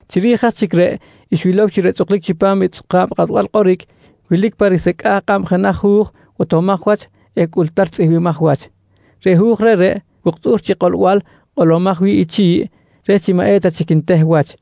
Chiri̱j aj chic reꞌ, xwilow chi reꞌ tzꞌuklic chipam i tzꞌuka̱b kꞌatbal kꞌoric wilic pa risecꞌa̱j kꞌab jenaj hu̱j botomaj wach eh cꞌultar tzꞌihmbimaj wach. Reꞌ hu̱j reꞌreꞌ wuktꞌu̱r chi kꞌolbal kꞌolomaj wi̱ꞌ i chi̱ꞌ reh chi maꞌ eta chic nteh wach.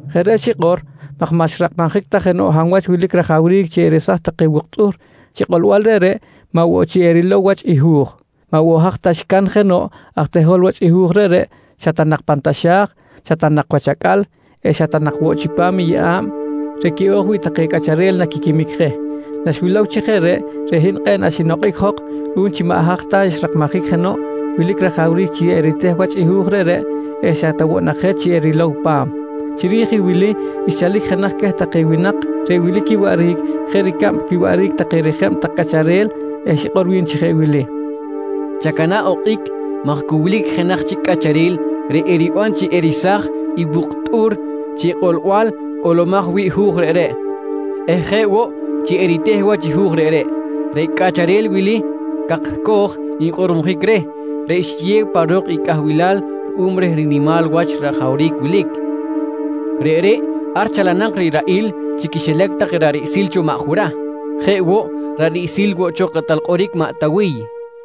Jeꞌ reꞌ xikꞌor maj maꞌ xrakmajic ta jenoꞌ hab wach wilic rajawric chi eresaj take wuktꞌu̱r chi kꞌolbal reꞌreꞌ, maꞌ woꞌ chi erilow wach i hu̱j. Maꞌ woꞌ haj ta xcan jenoꞌ aj tehol wach i hu̱j reꞌreꞌ, xa ta nak pan taxa̱j, xa ta nak wach acꞌal eh xa ta nak woꞌ chipam i yeꞌa̱b reꞌ quiꞌo̱j wi̱ꞌ take cꞌacharel naquiquimic je. Naxwilow chi jeꞌ reꞌ, reꞌ hin kꞌe̱ꞌ naxinokꞌic jok ruꞌum chi maꞌ haj ta xrakmajic jenoꞌ wilic rajawric chi riteheric wach i hu̱j reꞌreꞌ eh xa ta woꞌ nak je chi erilow pa̱m. Chiri̱j i wili xchalic jenaj queh take winak reꞌ wilic quiwaꞌric jeꞌ ricab quiwaꞌric take rijeb tak cꞌacharel eh xikꞌor wi̱n chi jeꞌ wili: «Chacana̱ꞌ okꞌic maj cu wilic jenaj chic cꞌacharel reꞌ eriban chi eresaj i wuktꞌu̱r chi kꞌolbal kꞌolomaj wi̱ꞌ i hu̱j reꞌreꞌ eh jeꞌ woꞌ chi eriteh wach i hu̱j reꞌreꞌ. Reꞌ cꞌacharel wili “Cakcoj” nkꞌormojic reh reꞌ xiyew pa ro̱k i cꞌahbilal ruꞌum reh rinimal wach rajawric wilic. Reꞌreꞌ ar chalanak riraꞌil chi quixilac take ra̱ꞌ riꞌsil cho maꞌ Jurah. Jeꞌ woꞌ, ra̱ꞌ riꞌsil woꞌ cho kꞌatal kꞌoric maꞌ Tawiy, nqui wi̱n.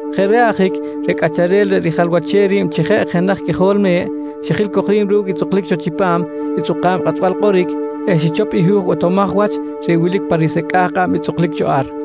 Jeꞌ reꞌ ajic reꞌ Cꞌacharel reꞌ rijalwachem ri̱b chi jeꞌ jenaj Qꞌuijol Me̱ꞌ, xijil cok ri̱b ru̱cꞌ i tzꞌuklic cho chipam i tzꞌuka̱b kꞌatbal kꞌoric eh xichop i hu̱j botomaj wach reꞌ wilic pan risecꞌa̱j kꞌab i tzꞌuklic cho ar.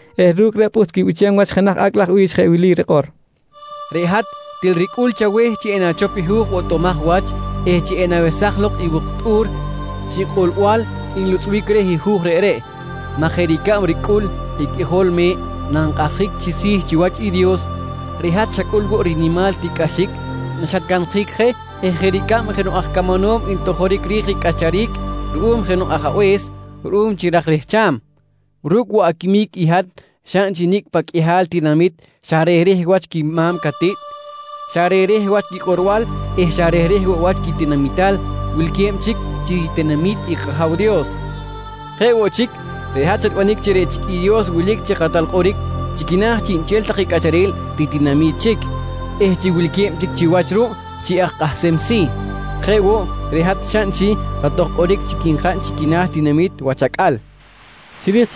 eh ru̱cꞌ reꞌ pꞌuht quibichem wach jenaj acꞌ laj bi̱ch jeꞌ wili rikꞌor: “Reꞌ hat til ricꞌul chaweh chi enachop i hu̱j botomaj wach eh chi enawesaj lok i wuktꞌu̱r chi kꞌolbal nlutzꞌbic reh i hu̱j reꞌreꞌ maj jeꞌ ricab ricꞌul i qꞌuijol me̱ꞌ nankꞌahsjic chi si̱ chiwach i Dios, reꞌ hat xacꞌul woꞌ rinimal tiꞌcꞌaxic naxatcansjic je eh jeꞌ ricab jenoꞌ aj camanom ntojoric ri̱j ricꞌacharic ruꞌum jenoꞌ ajabe̱s ruꞌum chi ra̱j rehcham, ru̱cꞌ woꞌ aquimic i hat xaꞌn chi nicꞌ paꞌ qꞌuihal tinamit xa rehreh wach quima̱m catiꞌt, xa rehreh wach quikꞌorbal eh xa rehreh woꞌ wach quitinamital wilque̱b chic chi ritinami̱t i kAja̱w Dios. Jeꞌ woꞌ chic, reꞌ hat xatbanic chi reꞌ chic i Dios wilic chi kꞌatal kꞌoric chi quina̱ chiꞌnchel take cꞌacharel ritinami̱t chic eh chi wilque̱b chic chiwach ruꞌ chi aj kꞌahsem si̱. Jeꞌ woꞌ, reꞌ hat xaꞌn chi kꞌatoj kꞌoric chic nkaꞌn chi quina̱ tinamit wach acꞌal, nqui rikꞌor i bi̱ch xcaꞌn.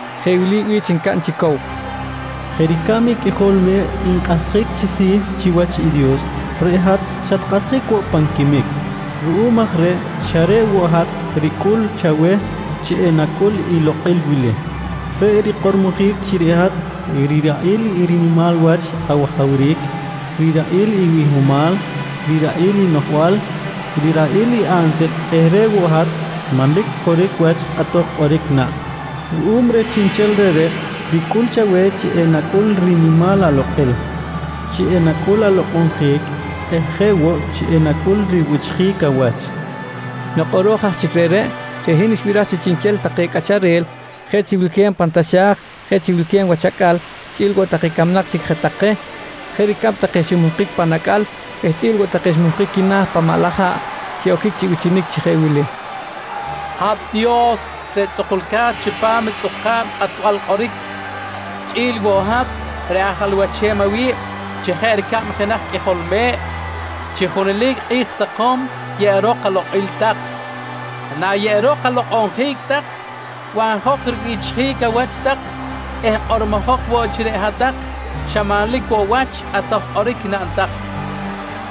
jeꞌ wili bichinic ncaꞌn chi cow: «Jeꞌ ricab i qꞌuijol me̱ꞌ nkꞌahsjic chi si̱ chiwach i Dios, reꞌ hat xatkꞌahsjic woꞌ pan quimic. Ruꞌum aj reꞌ xa reꞌ woꞌ hat ricꞌul chaweh chi enacꞌul i lokꞌil wili: Reꞌ rikꞌormojic chi reꞌ hat riraꞌil i rinimal wach awajawric, riraꞌil i bihomal, riraꞌil i noꞌjbal, riraꞌil i ansil eh reꞌ woꞌ hat manlic coric wach kꞌatoj kꞌoric naꞌn. Ruꞌum reh chiꞌnchel reꞌreꞌ, ricꞌul chaweh chi enacꞌul rinimal alokꞌil, chi enacꞌul alokꞌonjic eh jeꞌ woꞌ chi enacꞌul ribichjic awach, nqui take. Nok kꞌoro̱j aj chic reꞌreꞌ, reꞌ hin xnibiraj chi chiꞌnchel take cꞌacharel jeꞌ chi wilque̱b pan taxa̱j, jeꞌ chi wilque̱b wach acꞌal chꞌi̱l woꞌ take camnak chic je take jeꞌ ricab take ximuhkic pan acꞌal eh chꞌi̱l woꞌ take xmuhkic quina̱ pan maꞌ laj haꞌ, xiꞌoquic chi bichinic chi jeꞌ wili: «Hat Dios reꞌ tzꞌukulca̱t chipam i tzꞌuka̱b kꞌatbal kꞌoric chꞌi̱l woꞌ i hat reꞌ ajalwachem awi̱b chi jeꞌ ricab jenaj qꞌuijol me̱ꞌ, chi junelic kꞌi̱j sakom yeꞌerok alokꞌil tak. Nayeꞌerok alokꞌonjic tak, banjok ribichjic awach tak eh kꞌormojok woꞌ chi reꞌ hat-tak xa manlic woꞌ wach i kꞌatoj kꞌoric naꞌn tak, nqui take.